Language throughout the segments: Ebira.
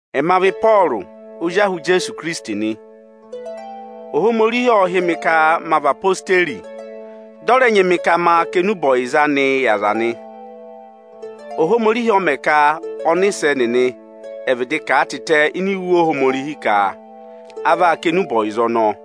Ẹma vị Ịpọọrụ ozi ahụ Ijeesu Ikirisiti nị. Ohomorihi ộ hị́ mị ka ma vị ozirẹma Ijeesu, dị ọ̀ rẹ nyị mị ka ma kà enube ọyịza anịị yị aza nị. Ohomorihi ộ mẹ̀ ka ọnịsẹ nịnị ẹ̀ vịdị kà a tịtẹ ini iwe Ohomorihi ka a vaa kà enube ọyịza ọnọọ.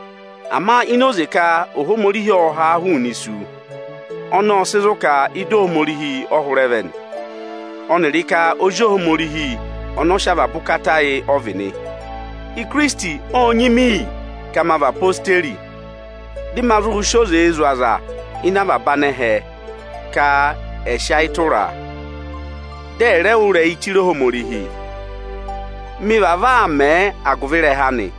Ama ini oze ka Ohomorihi ộ ha a hụụnị isu, ọnọọ ộ sị zụ̀ ka ịdị Ohomorihi ọ hụrẹ vẹ nị, ọnịrị ka Ozi Ohomorihi ọnị ọ sị avaba ụkata yị ọ vị nị. Ikirisiti ô nyị mi iyi ka ma vị ozirẹma anị, dị ma zụ sị oze zụ̀ avaba anẹhẹ ka ẹ̀ sị ayị tụra a, dị ẹ̀ rẹẹ wụ́ ịrẹyị chire Ohomorihi. Mi vavọọ aa mẹ agụvị ịrẹha anị.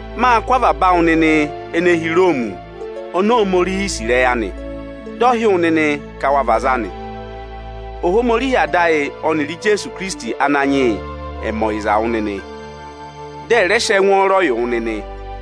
Mâ kụ́ avaba awụ nịnị ene hi Iroomi oni Ohomorihi sì ịrẹyị anị, dị ọ hị́ wụ nịnị ka wa vị aza anị. Ohomorihi Ada ayị ọnịrị Ijeesu Ananyị yị ọnị ọ nyị ka ọ̀ dọ yị há ẹ̀ mẹ ọyịza wụ nịnị, dị ẹ̀ rẹ sị ẹngwọọrọ yị wụ nịnị!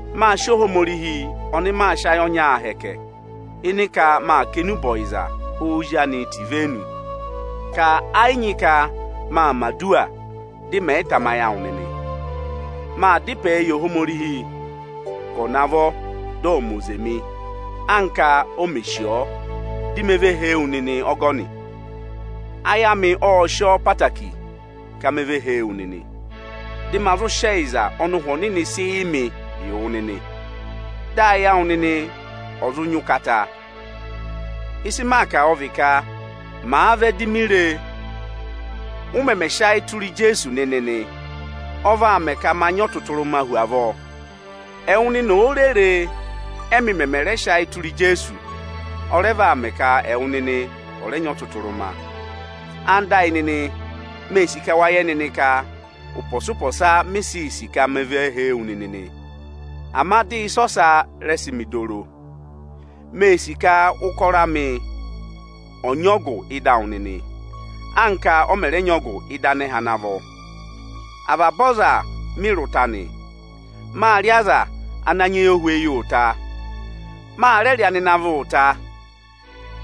Mâ sị Ohomorihi ọnị maa sị ayị ọnyaa hẹkẹ, ịnị ka maa kà enube ọyịza Ozi anị tẹ̀ ivenu, ka ẹ yị nyị ka maa mẹ̀ aduwa dị mẹ̀ yị tamayị awụ nịnị. Maa dá ịpẹẹ yị Ohomorihi ka ọ̀ navọ dị ọ̀ mẹ oze mị, anka o mè sì ọọ, dị me ve hee wu nịnị ọgọnị. Ayị amị ộ sị ọọ ẹtẹẹtẹrẹ ka me ve hee wu nịnị, dị ma zụ sị ẹyịza ọnị Ụhwẹ Ohomorihi sị yị mị yị wụ nịnị, dị ụ wa zụ nyị ụkata nịnị. Ịsị maa kà ọ vị ka, màa vẹ, di mi re ụ mẹmẹ sị ayị tụra Ijeesu nịnị nị, ọ vaa mẹ ka ma nyị ọtụtụrụma hu avọọ. Ẹwụ nịnị òo re re, ẹmị mẹmẹ rẹ sị ayị tụra Ijeesu, ọ rẹ vaa mẹ ka ẹwụ nịnị ọ rẹ nyị ọtụtụrụma. Ẹwụ nịnị ẹyịnyara amị, mee sì ka wa yẹ nịnị ka ụpọsa-ụpọsa mi sii sì ka me ve hee wu nịnị nị, ama dị ịsa ọsa rẹ sị mị dọ oro. Mee sì ka ụkọrọ amị ọ nyị ọgụ ịdị awụ nịnị, anka ọ mẹ̀ rẹ nyị ọgụ ịdị anẹhẹ ana vọ. Avaba aza mị rị ụta nị. Mâ rị aza ana nyị eyohweyi ụta; mâ rẹ rị anịnavị ụta.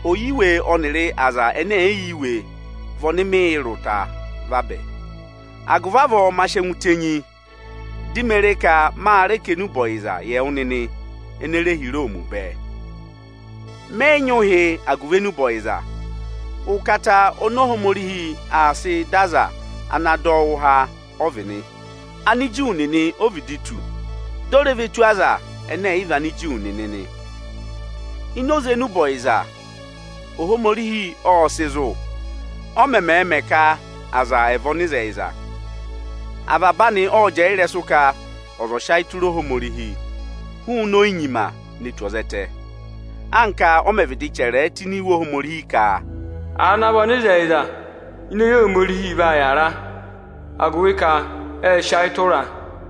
Ọyiwe ọnịrị aza ẹnẹ ẹ̀ yị yẹ iwe vị ọnị mị rị ụta vabẹ. Agụvị avọọ ma sị ẹngụ tenyi, di me re ka ma rẹ kà enube ọyịza yị ẹwụ nịnị ene re hi Iroomi bẹẹ. Mẹ yị nyị ụhị agụvị enube ọyịza. Ụkata oni Ohomorihi aa sị dọ ọza ana dọ wụ́ụ há ọ vị nị. Aniju nịnị o vịdị tù, di o re ve tù Anigiriki u nịnị nị. Ini oze enube ọyịza, Ohomorihi ộ sị zụ̀, ọ mẹmẹẹ̄ mẹ ka aza ẹ̀ vị ọnịzẹyịza. Avaba anị ộ jẹẹ tụ́ ịrẹsụ ka ọza ọ̀ sị ayị tụra Ohomorihi hụụnị oyinyima ne tù ẹzẹtẹ; anka a mẹ̀ vịdị chẹrẹ ẹ tụ́ ini Iwe Ohomorihi ka: Aza ana vị ọnịzẹyịza (ini eyi Ohomorihi) vaa yàra, agụvị ka ệ sị ayị tụra a.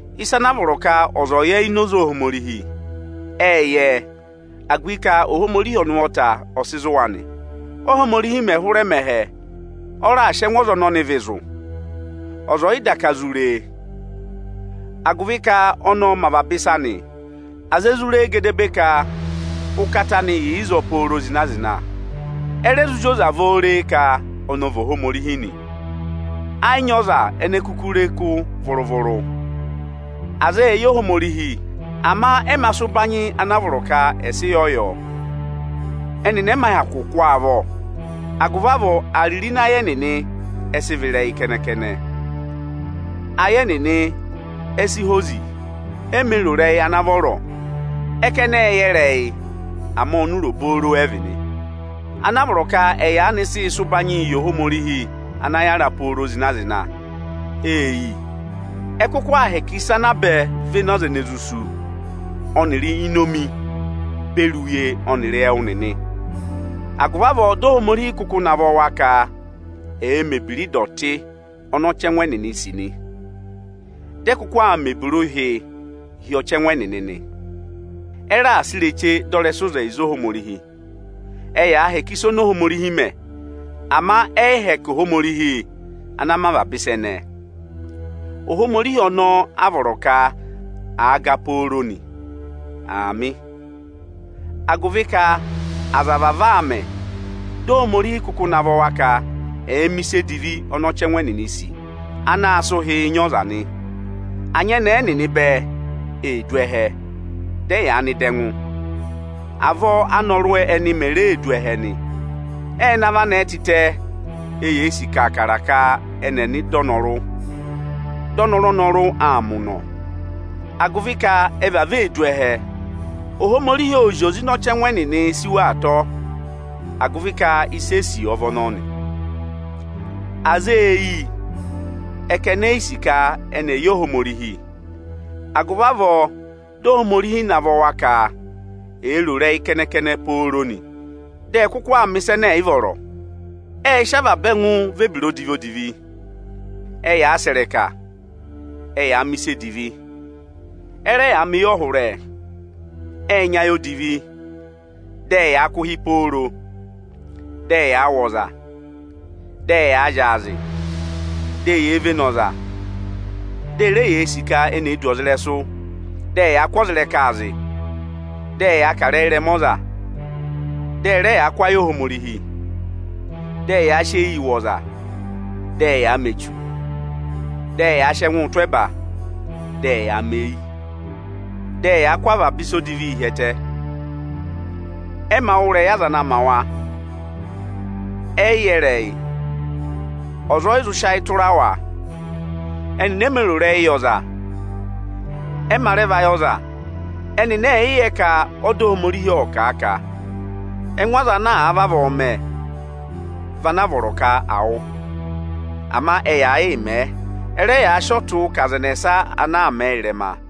Ịsa ana vọrọ ka aza ẹ̀ yẹ ini oze Ohomorihi, ệ yẹ ẹ, agụvị ka Ohomorihi ọnị ụvọta ọ sị zụ̀ wa nị. Óhomorihi mẹ̀ hụrẹ mẹ ẹhẹ, ọ raà sị ẹngụ ọza ọnị ọnị vị zụ̀, ọza ọ̀ yị daka zụ re e. Agụvị ka ọnị ọ mẹ avaba ịsa nị, aza e zụ re e gedebee ka ụkata anị yà ịzọọ pooro zịna-zịna. Ẹ rẹ zụ zị oze avọọ re e ka ọnị ọ vị Ohomorihi nị. Ẹ yị nyị ọza ene kuku re kụ́ vụrụ-vụrụ. Aza ệ yẹ Ohomorihi, ama ẹ mā sị ụbanyị ana a vọrọ ka à sị yọ; ẹnịnị ẹ mā hyakụ kụ́ ọ avọ. Agụvị avọọ, ịrẹyị kẹnẹ-kẹnẹ ẹnịnị kuku ee ro nị. Ayị ẹnịnị e si hozi, ẹnịnị e mē ro ịrẹyị ana vọrọ. Ẹ ka ẹnị ệ yẹ ịrẹyị, ama ọnụra obooro ẹ vị nị. Ana a vọrọ ka ẹ̀ yaanị sịị sị ụbanyịị yị Ohomorihi ana yára pooro zịna-zịna, ê yi. Ẹ kụkụ aa hẹkẹ ịsa ana a bẹ véné ọzarẹyịrẹsụ ọnịrị inomi beri uye ọnịrị ẹwụ nịnị. Agụvị avọọ di Ohomorihi kụkụ navọ wa ka ẹ̀ẹ mẹ̀ ebira ịdọtị ọnị ọchẹngụ ẹnịnị sì nị. Dị ẹ kụkụ aa mẹ̀ ebira ụhịị hi ọchẹngụ ẹnịnị nị. Ẹ raà sị ireche dọ ịzẹyịza Ohomorihi ịrẹsụ. Ẹyaa hẹkẹ ịsa ọnị Ohomorihi mẹ, ama ẹ yị hẹkẹ Ohomorihi ana mẹ avaba ịsa ẹnẹẹ. Ohomorihi ọnọọ a vọrọ ka àa ga pooro nị. Aamị. Agụvị ka aza vavọọ aa mẹ, di Ohomorihi kụkụ navọ wa ka ẹ̀ẹ mẹ̀ ịsa edivi ọnị ọchẹngụ ẹnịnịị̄ sì, anaā sịị ụhịị nyị ọza nị. Anyẹnẹẹ ẹnịnị bẹẹ ee du ẹhẹ, dị ẹyaa nọ ịdị ẹngụ. Avọọ anọrụ ẹnịnị me ree du ẹhẹ nị. Ệ navọ anẹẹ tịtẹ, eyee sì kaakara ka ẹnị ẹ̀ nọ ịdị ọnọrụ, ọnọrụ-ọnọrụ aa mẹ ụnọ. Agụvị ka ẹ vavọọ ee du ẹhẹ, Ohomorihi ô zi oze ịnị ọchẹngụ ẹnịnị sí wa atọ, agụvị ka ịsị e sì ọ vị ọnọọ nị. Aza ê yi, ẹ ka eni ee sì ka ẹnị ẹ̀ yẹ Ohomorihi. Agụvị avọọ, di Ohomorihi navọ wa ka èe ro ịrẹyị kẹnẹ-kẹnẹ, dị ẹẹ mẹ̀ ịsa ẹnẹ ẹ̀ yị vọrọ nị. Avaba ebira odivi vị ana yarị wa. Ẹyaa sẹ̀ ịrẹka, ẹyaa mẹ̀ ịsa edivi, ẹ rẹ yaa mẹ eyọhụrẹ, ệ nyị ayị odivi, dị ẹyaa kụ̀ ụhị pooro. Ẹyaa wụ̀ ọza, ẹyaa zyaazị, di eyee vene ọza, di e re yee sì ka eni ee du ọza ịrẹsụ. Dị ẹyaa kụ́ ọza ịrẹkaa zị, Dị ẹyaa kà ịrẹyị ịrẹma ọza, dị ẹ rẹ yaa kụ́ ayị Ohomorihi. Ẹyaa sị eyii wụ̀ ọza, dị ẹyaa mẹ echu, dị ẹyaa sị ẹngụụ tụ́ ẹba, dị ẹyaa mẹ eyi, dị ẹyaa kụ́ avaba ịsa odivii hi ẹtẹ. Ẹnịnị ẹ mā wụ́ ịrẹyị aza ana ma wa, ẹ yị yẹ ịrẹyị, ọza ọ yị zụ sị ayị tụra wa. Ẹnịnị e mē ro ịrẹyị ọyịza, ẹ mā rẹ vayị ọza. Ẹnịnị ệ yẹ ka ọda Ohomorihi ộ kà a ka ẹngụ ọza ana àa vavọọ mẹ, vị ana a vọrọ ka à wụ. Ama ẹyaa yịị mẹ̀ ẹ, ẹ rẹ yaa sị ọtụụ kà aza ẹnẹsa ana aa mẹ̀ ẹ ịrẹma.